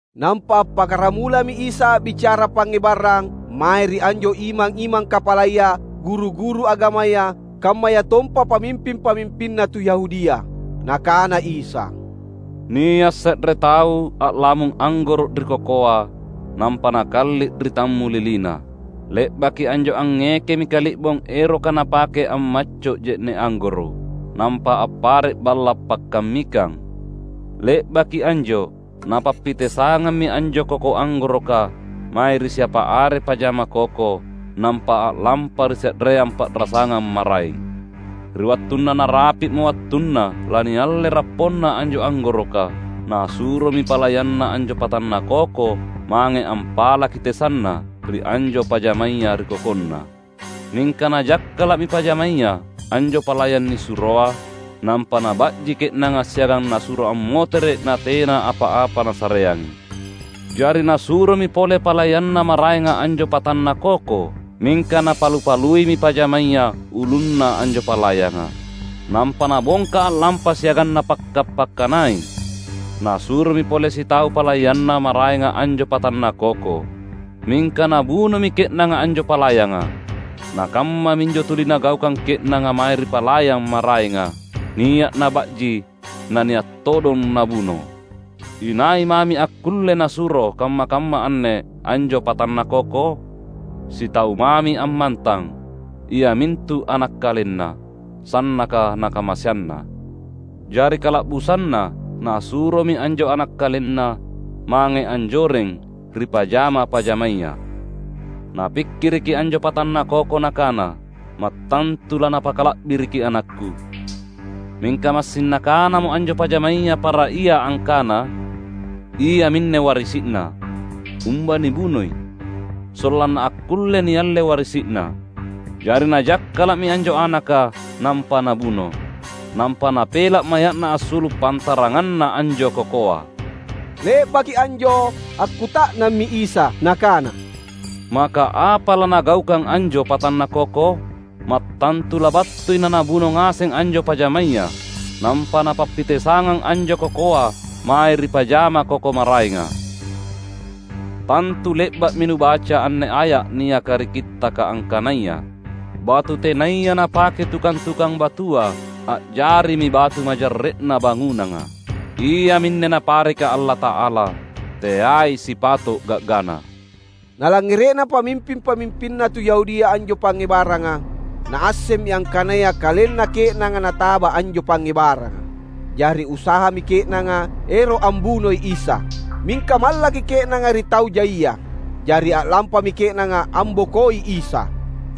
Nampa appakkaramulami Isa a’bicara pangngebarang mae ri anjo imang-imang kapalaya, guru-guru agamaya kammayatompa pamimping-pamimpinna tu Yahudia. Nakana Isa, "Nia’ se’re tau a’lamung anggoro’ ri kokoa, nampa nakalli’ ri tammulilina. Le’baki anjo angngekemi kali’bong eroka napake ammacco’ je’ne’ anggoro’. Nampa appare’ balla’ pakkammikang. Le’baki anjo napappitesangammi anjo koko anggoroka mae ri siapa are pajama koko, nampa a’lampa ri se’reang pa’rasangang maraeng. Ri wattunna narapi’mo wattunna lanialle rapponna anjo anggoroka, nasuromi palayanna anjo patanna koko mange ampalaki tesanna ri anjo pajamaya ri kokonna. Mingka najakkala’mi pajamaya anjo palayang nisuroa. Nampa naba’ji ke’nanga siagang nasuro ammotere’ natena apa-apa nasareangi. Jari nasuromi pole palayanna maraenga anjo patanna koko. Mingka napalu-paluimi pajamaya ulunna anjo palayanga, nampa nabongka a’lampa siagang napakka’-pakkanai. Nasuromi pole sitau palayanna maraenga anjo patanna koko. Mingka nabunomi ke’nanga anjo palayanga. Na kammaminjo tuli nagaukang ke’nanga mae ri palayang maraenga: nia’ naba’ji, na nia’ todong nabuno. Inai mami akkulle nasuro kamma-kamma anne anjo patanna koko? Sitau mami ammantang, iamintu ana’ kalenna, sannaka nakamaseanna. Jari kala’busanna nasuromi anjo ana’ kalenna mange anjoreng ri pajama-pajamaya. Napikkiriki anjo patanna koko nakana, ‘Mattantu lanapakala’biriki anakku.’ Mingka massing nakanamo anjo pajamaya para ia angkana, ‘Iaminne warisi’na. Umba nibunoi, sollanna akkulle nialle warisi’na!’ Jari najakkala’mi anjo anaka, nampa nabuno. Nampa napela’ maya’na assulu’ pantaranganna anjo kokoa." Le’baki anjo akkuta’nammi Isa Nakana, "Maka apa lanagaukang anjo patanna koko? Mattantu labattui na nabuno ngaseng anjo pajamaya. Nampa napappitesangang anjo kokoa mae ri pajama koko maraenga. Tantu le’ba’mi nubaca anne aya’ niaka ri Kittaka angkanaya, ‘Batu tenaya napakei tukang-tukang batua a’jarimi batu majarre’na bangunanga. Iaminne Napareka Allata’ala; teai sipato’ ga’gana!’" Nalangngere’na pamimping-pamimpinna tu Yahudia anjo pangngebaranga naassemmi angkanaya kalenna ke’nanga nataba anjo pangngebaranga. Jari usahami ke’nanga ero’ ambunoi Isa. Mingka mallaki ke’nanga ri tau jaia. Jari a’lampami ke’nanga ambokoi Isa.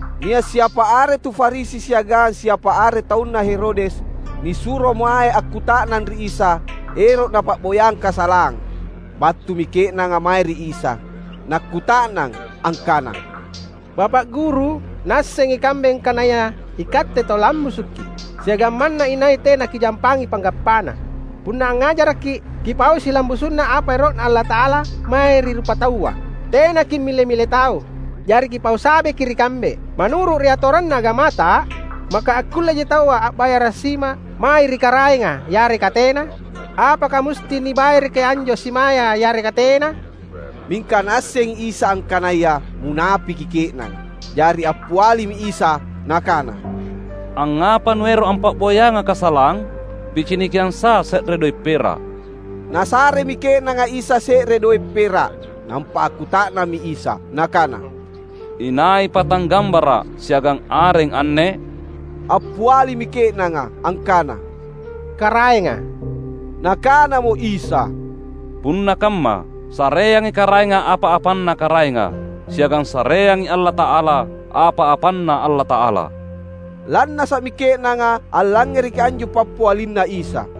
Nia’ siapa are tu Farisi siagang siapa are taunna Herodes nisuro mae akkuta’nang ri Isa, ero’ napa’boyang kasalang. Battumi ke’nanga mae ri Isa nakkuta’nang angkana, "Bapa’ Guru, naassengi kambe angkanaya iKatte tau lambusukKi’, siagang manna inai tena Kijampangi panggappana. Punna angngajarakKi’ Kipaui silambusu’na apa ero’Na Allata’ala mae ri rupataua. Tena kimmile-mile tau. Jari Kipau sabeki ri kambe, ‘Manuru’ ri atoranna agamata, maka akkulleji taua a’bayara’ sima mae ri Karaenga yareka tena? Apaka musti nibayaraki anjo simaya yareka tena?’" Mingka Naassengi Isa angkanaya munapeki ke’nanga. Jari appialimi Isa Nakana, "Angngapa nuero’ ampa’boyangA’ kasalang? PicinikiangsA’ se’re doe’ pera’." Nasaremi ke’nanga Isa se’re doe’ pera’. Nampa akkuta’nammi Isa Nakana, "Inai pata gambara’ siagang areng anne?" Appialimi ke’nanga angkana, "Karaenga." Nakanamo Isa, "Punna kamma, sareangi Karaenga apa-apanna Karaenga, siagang sareangi Allata’ala apa-apanNa Allata’ala." Lannasa’mi ke’nanga allangngereki anjo pappialinNa Isa.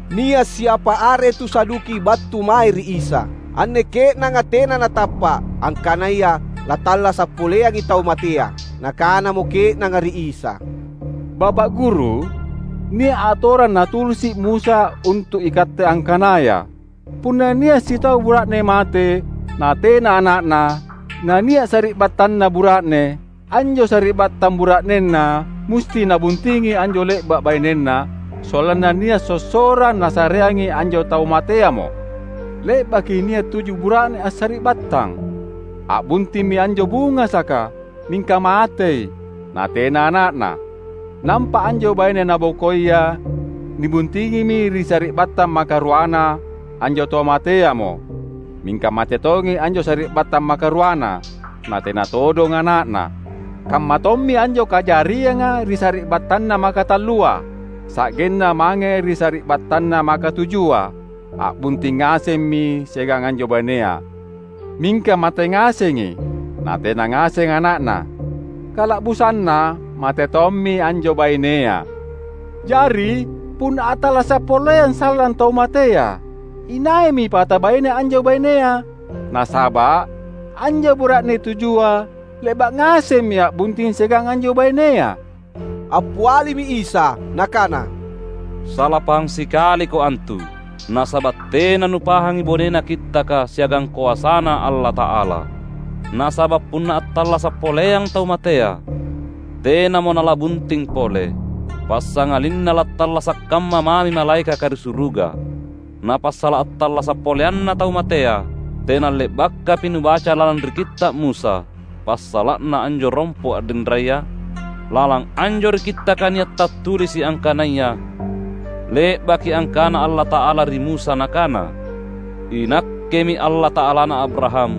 Nia’ siapa are tu Saduki battu mae ri Isa. (Anne ke’nanga tena natappa’ angkanaya lattallasa’ poleangi tau matea.) Nakanamo ke’nanga ri Isa, "Bapa’ Guru, nia’ atorang natulisi’ Musa untu’ ikatte angkanaya: ‘Punna nia’ sitau bura’ne mate natena ana’na, nania’ sari’battanna bura’ne, anjo sari’battang bura’nena musti nabuntingi anjo le’ba’ bainenna sollanna nia’ sossorang nasareangi anjo tau mateamo.’ Le’baki nia’ tuju bura’ne assari’battang. A’buntimmi anjo bungasaka, mingka matei, natena ana’na. Nampa anjo baine nabokoia nibuntingimi ri sari’battang makaruana anjo tau mateamo. Mingka mate tongi anjo sari’battang makaruana, na tena todong ana’na. Kammatommi anjo kajarianga ri sari’battanna makatallua, sa’genna mange ri sari’battanna makatujua, a’bunting ngasemmi siagang anjo bainea. Mingka mate ngasengi, natena ngaseng ana’na. Kala’busanna mate tommi anjo bainea. Jari punna attallasa’ poleang sallang tau matea, inaimi pata baine anjo bainea. Nasaba’ anjo bura’ne tujua le’ba’ ngasemmi a’bunting siagang anjo bainea!" Appialimi Isa Nakana, "Sala pahang sikaliko antu. Nasaba’ tena nupahangi bonena Kittaka siagang koasaNa Allata’ala. Nasaba’ punna attallasa’ poleang tau matea, tenamo nala’bunting pole. Passangalinna lattallasa’ kamma mami malaekaka ri suruga. Na passala’ attallasa’ poleanna tau matea, tena le’bakapi nubaca lalang ri Kitta’ Musa passala’na anjo rompo’ a’rinraya? Lalang anjo ri Kittaka nia’ tattulisi’ angkanaya le’baki angkana Allata’ala ri Musa Nakana, ‘INakkemi Allata’alana Abraham,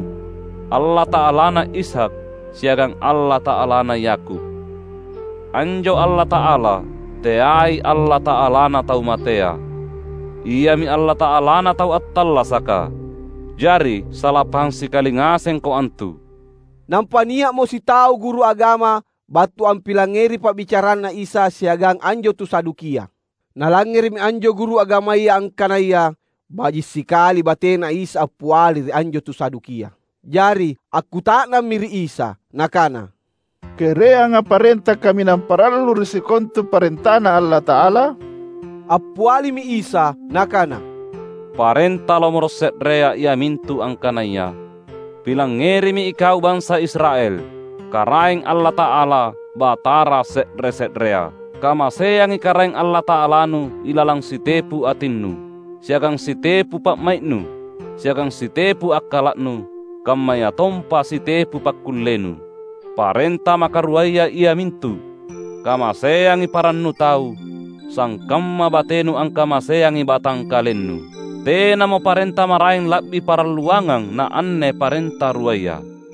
Allata’alana Ishak, siagang Allata’alana Yakub.’ Anjo Allata’ala, teai Allata’alana tau matea. Iami Allata’alana tau attallasaka. Jari sala pahang sikali ngasengko antu!" Nampa nia’mo sitau guru agama battu ampilangngeri pa’bicaranNa Isa siagang anjo tu Sadukia. Nalangngere’mi anjo guru agamaya angkanaya baji’ sikali batena Isa appiali ri anjo tu Sadukia. Jari akkuta’nammi ri Isa nakana, "Kereanga parenta kaminang parallu ri sikontua parentaNa Allata’ala?" Appialimi Isa Nakana, "Parenta lomoro’ se’rea iamintu angkanaya: ‘Pilangngerimi ikau bansa Israel! Karaeng Allata’alata, Batara se’re-se’rea. Kamaseangi Karaeng Allata’alanu ilalang sitepu atinnu, siagang sitepu pa’mai’nu, siagang sitepu akkala’nu, kammayatompa sitepu pakkullenu.’ Parenta makaruaya iamintu: ‘Kamaseangi parannu tau, sangkamma batenu angkamaseangi batangkalennu.’ Tenamo parenta maraeng la’bi paralluangang naanne parenta ruaya."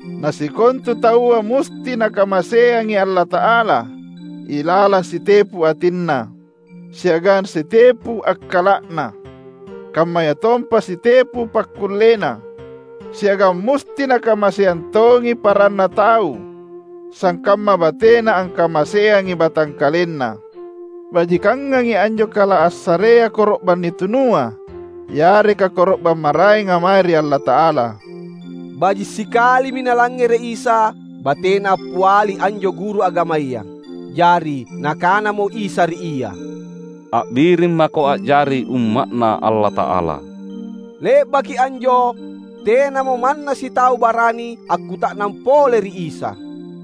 Na sikontu taua musti nakamaseangi Allata’ala ilalang sitepu atinna, siagang sitepu akkala’na, kammayatompa sitepu pakkullena. Siagang musti nakamaseang tongi paranna tau sangkamma batena angkamaseangi batangkalenna. Bajikangangi anjo kala assarea koro’bang nitunua yareka koro’bang maraenga mae ri Allata’ala." Baji’ sikalimi Nalangngere’ Isa batena appiali anjo guru agamaya. Jari Nakanamo Isa ri ia, "A’birimmako a’jari umma’Na Allata’ala." Le’baki anjo tenamo manna sitau barani akkuta’nang pole ri Isa.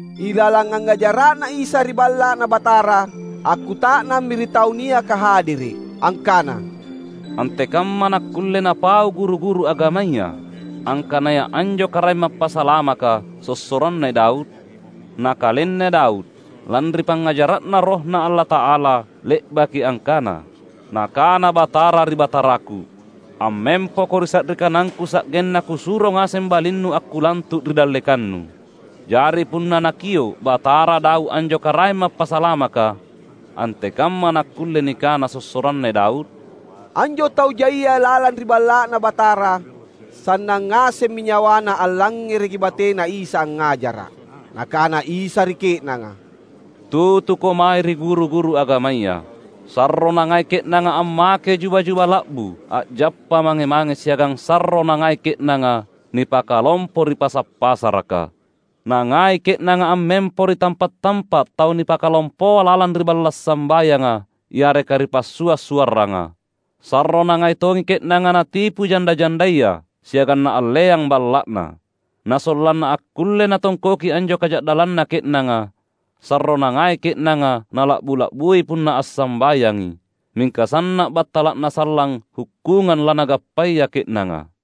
Ilalang angngajara’Na Isa ri Balla’Na Batara, akkuta’nammi ri tau niaka hadere’ angkana, "Antekamma nakkulle napau guru-guru agamaya angkanaya anjo Karaeng Mappasalamaka sossoranna Daud? Na kalenna Daud, lanri pangngajara’Na RohNa Allata’ala, le’baki angkana, ‘Nakana Batara ri Bataraku: Ammempoko ri sa’ri kanangKu Sa’genna Kusuro ngaseng balinNu akkulantu’ ri dallekanNu.’ Jari punna nakio’ ‘Batara’, Daud anjo Karaeng Mappasalamaka, antekamma nakkulle nikana sossoranna Daud?" Anjo tau jaia lalang ri Balla’Na Batara sannang ngasemmi nyawana allangngereki bateNa Isa angngajara’. Nakana Isa ri ke’nanga: "Tutuko mae ri guru-guru agamaya. Sarro nangai ke’nanga ammake juba-juba la’bu a’jappa mange-mange siagang sarro nangai ke’nanga nipakalompo ri pasa’-pasaraka. Nangai ke’nanga ammempo ri tampa’-tampa’ tau nipakalompoa lalang ri balla’ sambayanga yareka ri passua’-suarranga. Sarro nangai tongi ke’nanga natipu janda-jandaya siagang naalleang balla’na. Na sollanna akkulle natongkoki anjo kaja’dallanna ke’nanga, sarro nangai ke’nanga nala’bu-la’bui punna assambayangi. Mingka sanna’ battala’na sallang hukkungang lanagappaya ke’nanga!"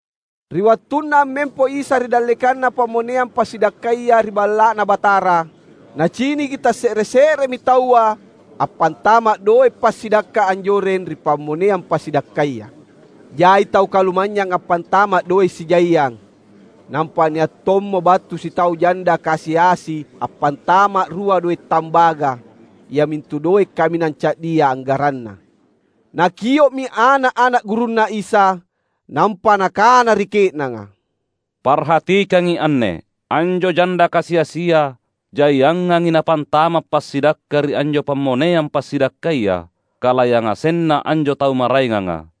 Ri wattunna ammempo Isa ri dallekanna pammoneang passidakkaya ri Balla’Na Batara, Naciniki tasse’re-se’remi taua appantama’ doe’ passidakka anjoreng ri pammoneang passidakkaya. Jai tau kalumanynyang appantama’ doe’ sijaiang. Nampa nia’ tommo battu sitau janda kasi-asi appantama’ rua doe’ tambaga, iamintu doe’ kaminang ca’dia anggaranna. Nakio’mi ana’-ana’ gurunNa Isa nampa Nakana ri ke’nanga, "Parhatikangi anne: Anjo janda kasi-asia jaiangangi napantama’ passidakka ri anjo pammoneang passidakkaya kala yangasenna anjo tau maraenganga.